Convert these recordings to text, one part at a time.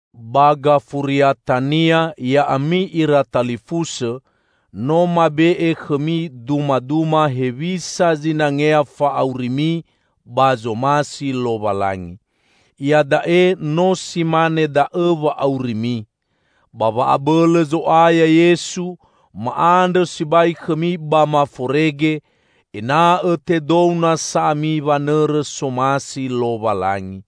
Ba gafuriatania, ya'ami ira talifusõ, no mabe'e khõmi dumaduma hewisa zinangea fa'aurimi ba zomasi Lowalangi. Iada'e no si mane da'õ wa'aurimi. Ba wa'abõlõ Zo'aya Yesu, ma'andrõ sibai khõmi ba maforege, ena'õ tedou nasa ami wanõrõ somasi Lowalangi.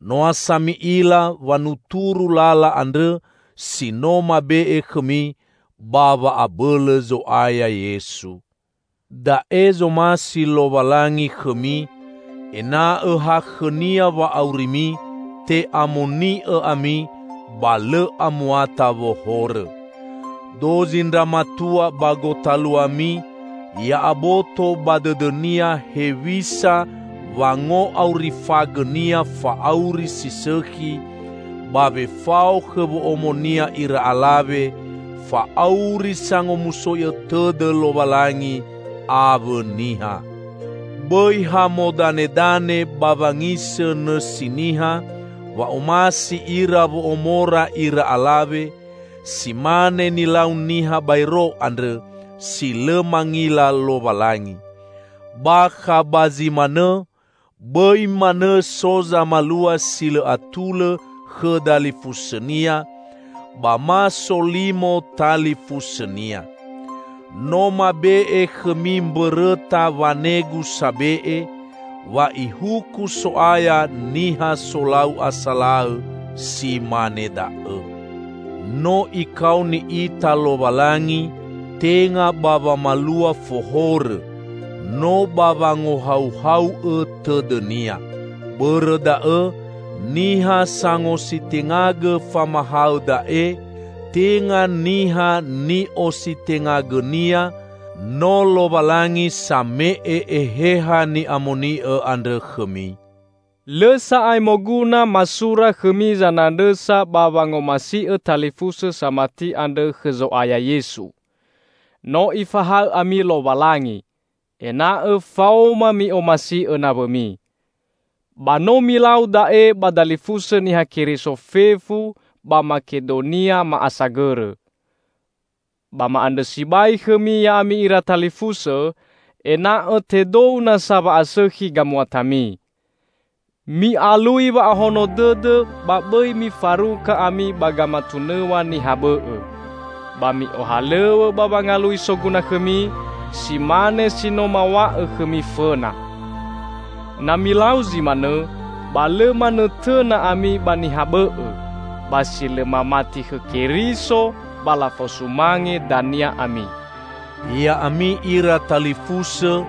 Noa sa mi'ila wanuturu lala andrõ si no mabe'e khõmi ba wa'abõlõ Zo'aya Yesu. Da'e zomasi Lowalangi khõmi: Ena'õ ha khõ-Nia wa'aurimi, te'amoni'õ ami, ba lõ amuata wohorõ. Dozi ndra matua ba gotaluami, ya'aboto ba dõdõnia hewisa wango'aurifagõnia fa'auri si sõkhi ba wefao khõ wo'omonia ira alawe, fa'auri sangomusoi'õ tõdõ Lowalangi awõ niha. Bõi ha modanedane ba wangisõ nõsi niha wa'omasi ira wo'omora ira alawe, si mane nilau niha baero andrõ, si lõ mangila Lowalangi. Bakha ba zi manõ, bõi manõ so zamalua si lõ atulõ khõ dalifusõnia, ba ma solimo talifusõnia. No mabe'e khõmi mbõrõta wanegu sabe'e, wa Ihuku So'aya niha solau asalaõ si mane da'õ. No Ikaoni ita Lowalangi tenga ba wamalua fohorõ, no ba wangohauhau'õ tõdõ-Nia. Bõrõ da'õ, niha sangositengagõ famahaõ da'e, tenga niha ni'ositengagõnia, no Lowalangi same'e Eheha ni'amoni'õ andrõ khõmi. Lõ sa'ae moguna masura khõmi zanandrõsa ba wangomasi'õ talifusõ samati andrõ khõ Zo'aya Yesu. No Ifahaõ ami Lowalangi, ena'õ faoma mi'omasi'õ nawõmi. Ba no milau da'e ba dalifusõ Niha Keriso fefu ba Makedonia ma'asagõrõ. Ba ma'andrõ sibai khõmi ya'ami ira talifusõ, ena'õ tedou nasa wa'asõkhi gamuatami. Mi'alui wa'ahono dõdõ ba bõi mifaruka ami ba gamatunõw̃a niha bõ'õ. Ba mi'ohalõw̃õ ba wangalui soguna khõmi, si mane si no maw̃a'õ khõmi fõna. Na milau zi manõ, ba lõ manõtõna ami ba niha bõ'õ; ba si lõ mamati khõ Keriso ba lafosumange dania ami. Ya'ami ira talifusõ,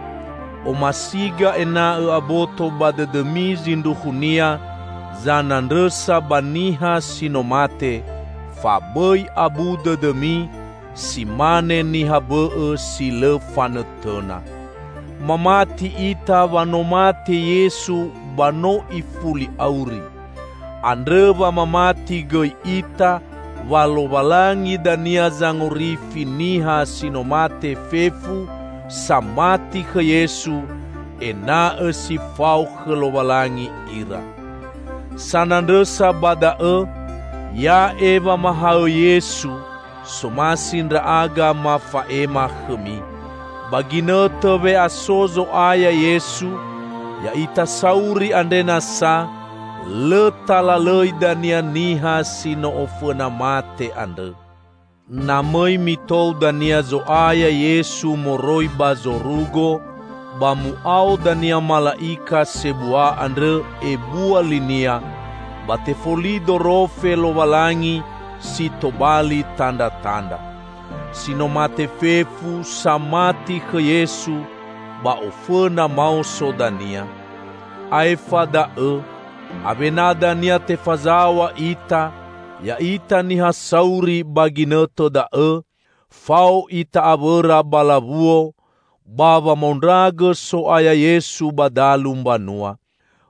omasiga ena'õ aboto ba dõdõmi zindruhunia zanandrõsa ba niha si no mate; fa bõi abu dõdõmi, si mane niha bõ'õ, si lõ fanõtõna. Mamati ita wa no mate Yesu ba no ifuli auri. Andrõ wa mamati gõi ita, wa Lowalangi dania zangorifi niha si no mate fefu samati khõ Yesu, ena'õ si fao khõ Lowalangi ira. Sanandrõsa ba da'õ, ya'e wamahaõ Yesu, somasi ndra'aga mafa'ema khõmi: Ba ginõtõ we'aso Zo'aya Yesu, ya'ita sauri andre nasa lõ talalõi dania niha si no ofõna mate andrõ. Na mõi mitou dania Zo'aya Yesu moroi ba zorugo, ba mu'ao dania mala'ika sebua andrõ, ebua linia, ba tefoli dorofe Lowalangi si tobali tandratandra. Si no mate fefu, samati khõ Yesu, ba ofõna maoso dania. Aefa da'õ, awena dania tefazaw̃a ita, ya'ita niha sauri ba ginõtõ da'õ, fao ita awõra ba lawuo, ba wamaondragõ So'aya Yesu ba dalu mbanua.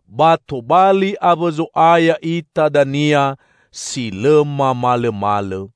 Ba tobali awõ Zo'aya ita dania si lõ mamalõmalõ.